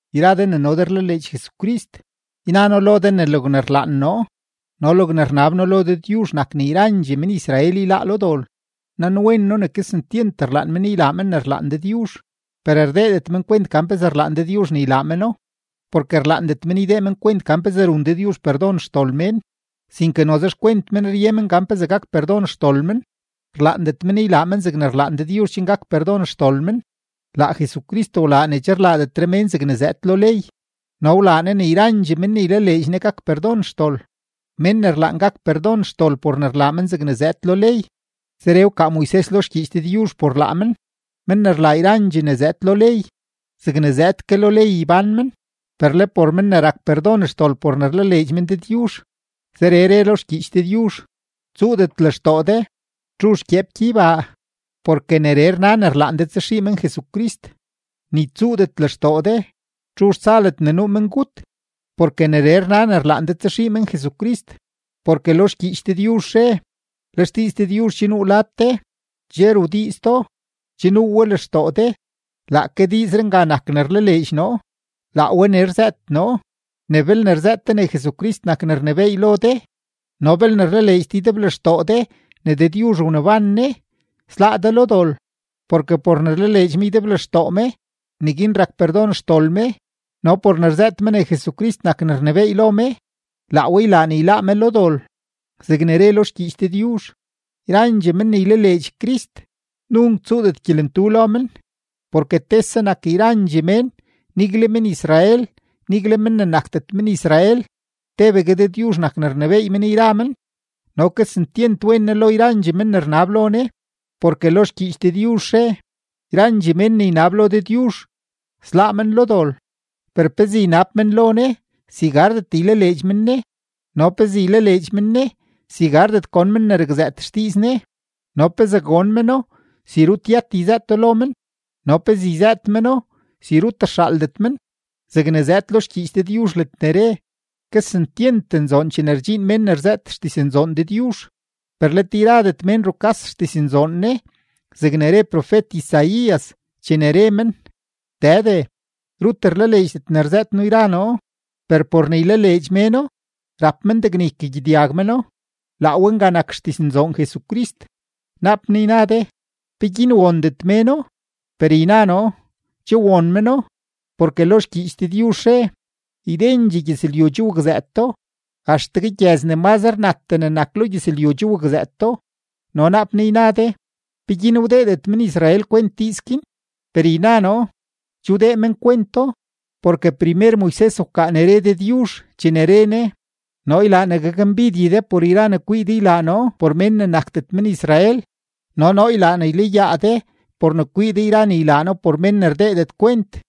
Yra de ne no de rlaleedx Jesucrist, yna noo lo de ne logne rlaan noo no logne rnab noo lo Dëdyuzh nak ne yrandxee men-Israel yláá lo dol. Nanwen noo ne kesentyent rlaan men ylaa men ne rlaan Dëdyuzh, per rdeedet men kwent gan pezee rlaan Dëdyuzh ne ylaa meno. Porke rlaandet men ydee men kwent gan pezee run Dëdyuzh perdon xdol mén, sinke noze xkwent men rye men gan pezee gak perdon xdol men, rlaandet men ylaa men zegne rlaan Dëdyuzh chen gak perdon xdol men. Laa Jesucrist wlaa ne che rlaadetre mén zegne zëëd lo ley no wlaa Ne ne yrandxee men ne ylaleedx Ne gak perdon xdol. Mén ne rlaan gak perdon xdol por ne rlaa men zegne zëëd lo ley, zeree wkaa Moises lo xgyiich Dëdyuzh por laa men: “Men ne rlaa yrandxee ne zëëd lo ley, zegne zëëd ke lo ley ybán men.” Per le por men ne rak perdon xdol por ne rlaleedx men Dëdyuzh, zeree re lo xgyiich Dëdyuzh: “Tsuudet lextoo de: ¿Txuzh gyeep gyeybaa? (Porke neree rna ne rlaan de tsaxii men Jesucrist.) Ni tsuudet lextoo de: ¿Txuzh tsa ledne nuu mengut?” (Porke neree rna ne rlaan de tsaxii men Jesucrist.) Porke lo xgyiich Dëdyuzh re: “Le xdiiz Dëdyuzh che nuu lad de, che rudiiz do, che nuu we lextoo de.” Laake diizree nga nak ne rlaleedx noo, laa we ne rzëët noo, ne belne rzëët de ne Jesucrist nak ne rnebééy lo de no belne rlaleedx de ydeblextoo de ne Dëdyuzh wneban Ne, sláá de lo dol. Porke por ne rlaleedx me ydeblextoo me, neguin rak perdon xdol me, no por ne rzëët me ne Jesucrist nak ne rnebééy lo me, laa we ylaa ne yláá me lo dol. Zegne re lo xgyiich Dëdyuzh: “Yrandxee men ne ylaleedx Crist, nunk tsuudet gyelentu lo men.” Porke tese nak yrandxee mén, nigle men-Israel, nigle men ne nakdet men-Israel; tebegue Dëdyuzh nak ne rnebééy men yra men no kesentyent wen Ne lo yrandxee men ne rnab lo Ne. Porke lo xgyiich Dëdyuzh re: “Yrandxee mén ne ynab lo Dëdyuzh, sláá men lo dol.” Per ¿pezee ynab men lo Ne, si gardet ylaleedx men Ne? ¿No pezee ylaleedx men Ne, si gardet gon men ne rakzëët xdiiz Ne? ¿No pezee gon meno, si rut yët yzëëto lo men? ¿No pezee yzëët meno, si rut rxaaldet men? Zegne zëëd lo xgyiich Dëdyuzh ledne re: “¡Kesentyent nzoon chene rdxiin mén ne rzëët xdiznzoon Dëdyuzh!” Per let yradet mén rukas xdiznzoon Ne, zegne re profet-Isaías chene re men: “Dëde, rut rlaleedxdet ne rzëët noo yra noo.” Per por ne ylaleedx méno, rap men degne ykagyedyag meno, laa we nga nak xdiznzoon Jesucrist. Naap naa yna de: “¿Peguin wondet méno?” Per yna noo, che won meno, porke lo xgyiich Dëdyuzh re: Ydendxee gyëzlyu che wakzëëto, axtegue gyëz ne mazre natdee ne nak lo gyëzlyu che wakzëëto. No naap naa yna de: “¿Peguin wdeedet men-Israel kwent diiz guin?” Per yna noo, che wdee men kwento, porke primer Moises wkaa ne re Dëdyuzh chene re Ne: Noo ylaa ne gakmbidye de por yra ne kwii de ylaa noo por mén ne nakdet men-Israel; no noo ylaa ne ylayaa de por ne kwii de yra ne ylaa noo por men ne rdeedet kwent.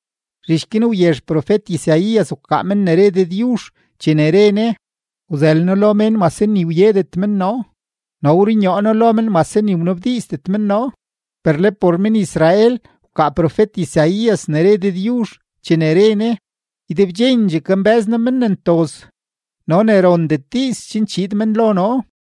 Zhich guin wyezh profet-Isaías wkaa men ne re Dëdyuzh, chene re Ne: Wzël noo lo mén mase ni wyedet men noo, no wrunyoo noo lo men mase ni wnabdiizdet men noo. Per le por men-Israel wkaa profet-Isaías ne re Dëdyuzh chene re Ne: “Ydebdxendxee kambë́z noo men ne ntoz no le ne rondet diiz chen chiid men lo noo.”